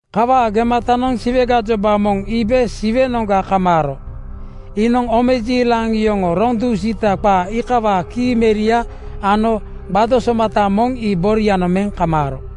Kawaa gematanoŋ Siwe gajoba moŋ iibe Siwenoŋga kamaaro. Iinoŋ omejiilaŋ yoŋoo roŋ dusiita qaa iikawaa kii meria ano gbado somata moŋ ii borianoŋ meŋ kamaaro.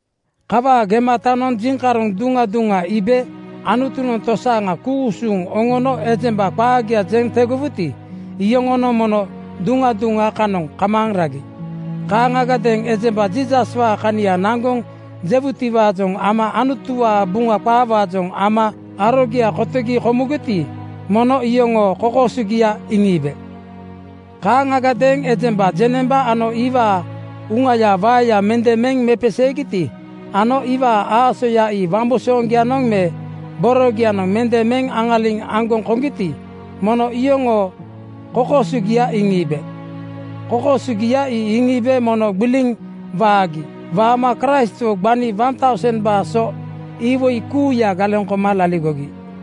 Kawaa gematanoŋ jiŋkaroŋ duŋa duŋa iibe. Anutunoŋ tosaaŋa ku-usuŋ oŋono ejemba qaagia jeŋ tegowuti, iyoŋonoŋ mono duŋa duŋa kanoŋ kamaaŋ ragi. Kaaŋagadeeŋ ejemba Jiisaswaa kania naŋgoŋ jegitiwaajoŋ ama Anutuwaa Buŋa qaawaajoŋ ama arogia kotogi komugiti, mono iyoŋoo kokoosogia iŋiibe. Kaaŋagadeeŋ ejemba jeŋnemba ano iwaa uŋayaa waeya mende meŋ mepeseegiti ano iwaa aasoya ii wambusooŋgianoŋ me borogianoŋ mende meŋ aŋaliŋ aŋgoŋ koŋgiti, mono iyoŋoo kokoosogia iŋiibe. Kokoosogia ii iŋiibe mono gbiliŋ waagi. Waama Kraistwo gbani 1,000:baa so iwoi kuuya galeŋ koma laligogi.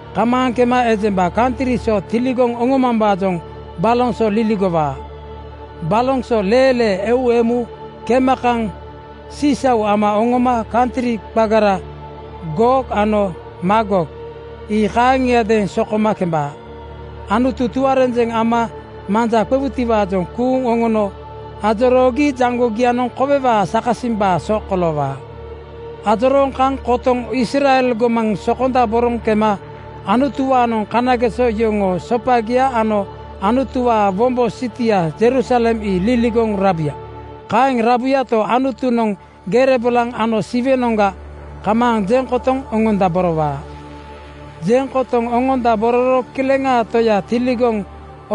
Kamaaŋ kema ejemba kantri so tiligoŋ oŋomambaajoŋ baloŋ so liligowaa. Baloŋ goraaya leelee eu emu kema kaŋ (uugia moŋgosooŋ) sisau ama oŋoma kantri qagara Goog ano Maagog ii kaaŋiadeeŋ sokoma kembaa. Anutu tuarenjeŋ ama manja qewutiwaajoŋ kuuŋ oŋono ajoroogi jaŋgogianoŋ kowewaa sakasimbaa so koloowaa. Ajorooŋ kaŋ kotoŋ Israel gomaŋ sokondaboroŋ kema Anutuwaanoŋ kanageso yoŋoo sopagia ano Anutuwaa wombo sitia (Jerusalem) ii liligoŋ rabuya. Kaeŋ rabuyato, Anutunoŋ gere bolaŋ ano siwenoŋga kamaaŋ jeŋ kotoŋ oŋondaborowaa. Jeŋ kotoŋ oŋondabororo Kileŋaa Toya tiligoŋ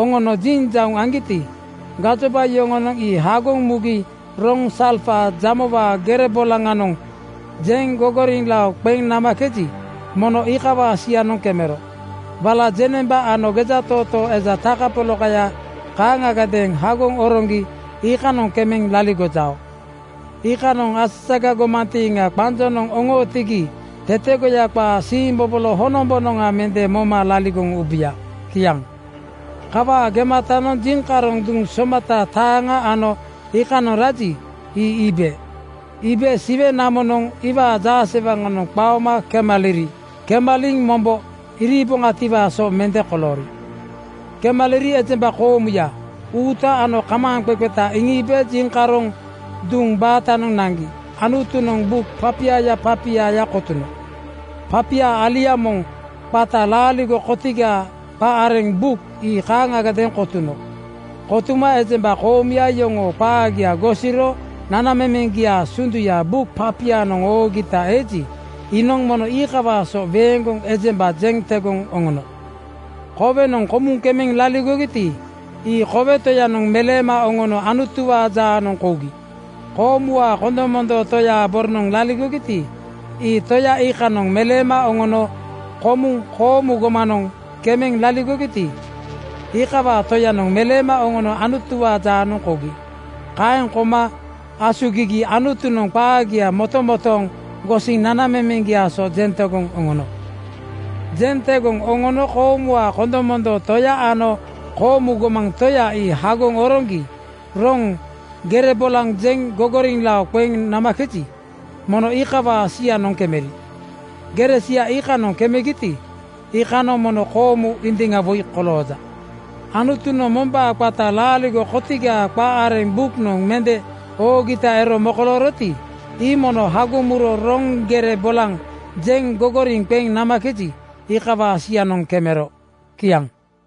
oŋono jinjauŋ aŋgiti, gajoba yoŋonoŋ ii hagoŋ mugi roŋ salfa jamowaa gere bolaŋanoŋ jeŋ gogoriŋlao qeŋ namakeji, mono iikawaa sianoŋ kemero. Wala jeŋnemba ano gejatootoo eja takapolakaya kaaŋagadeeŋ hagoŋ oroŋgi iikanoŋ kemeŋ laligojao. Iikanoŋ asaga gomantiiŋa qanjonoŋ oŋootigi tetegoya qaa siimbobolo honombonoŋa mende moma laligoŋ ubuya. Kiaŋ. Kawaa gematanoŋ jiŋkaroŋ duŋ somata taaŋa ano iikanoŋ raji, ii iibe. Iibe siwe namonoŋ iwaa jaasewaŋanoŋga qaoma kemaliri. Kemaliŋ mombo iriiboŋatiwaa so mende koloori. Kemaliri ejemba koomuya uuta ano kamaaŋqeqeta iŋiibe jiŋkaroŋ duŋ batanoŋ naŋgi Anutunoŋ buk papiaya papiaya kotuno. Papia alia moŋ qata laaligo kotigaa qa areŋ buk ii kaaŋagadeeŋ kotuno. Kotuma ejemba koomuya yoŋoo qaagia gosiro nanamemeŋgiaa sunduya buk papianoŋ oogita eji, iinoŋ mono iikawaa so weeŋgoŋ ejemba jeŋ tegoŋ oŋono. Kowenoŋ komuŋ kemeŋ laligogiti, ii kowe Toyanoŋ meleema oŋono Anutuwaa jaanoŋ kougi. Koomuwaa kondomondoo Toyaa boronoŋ laligogiti, ii Toya iikanoŋ meleema oŋono. Komuŋ koomu gomanoŋ kemeŋ laligogiti, ii iikawaa Toyanoŋ meleema oŋono Anutuwaa jaanoŋ kougi. Kaeŋ kouma asugigi Anutunoŋ qaagia motomotooŋ gosiŋ nanamemeŋgiaa so jeŋ tegoŋ oŋono. Jeŋ tegoŋ oŋono koomuwaa kondomondoo Toya ano koomu gomaŋ Toya ii hagoŋ oroŋgi roŋ gere bolaŋ jeŋ gogoriŋlao qeŋ namakeji, mono iikawaa sianoŋ kemeri. Gere sia iikanoŋ kemegiti, iikanoŋ mono koomu indiŋa woi kolooja. Anutunoŋ mombaa qata laaligo kotigaa qa areŋ buknoŋ mende oogita ero mokolooroti, ii mono hagoŋ muro roŋ gere bolaŋ jeŋ gogoriŋ qeŋ namakeji, iikawaa sianoŋ kemero. Kiaŋ.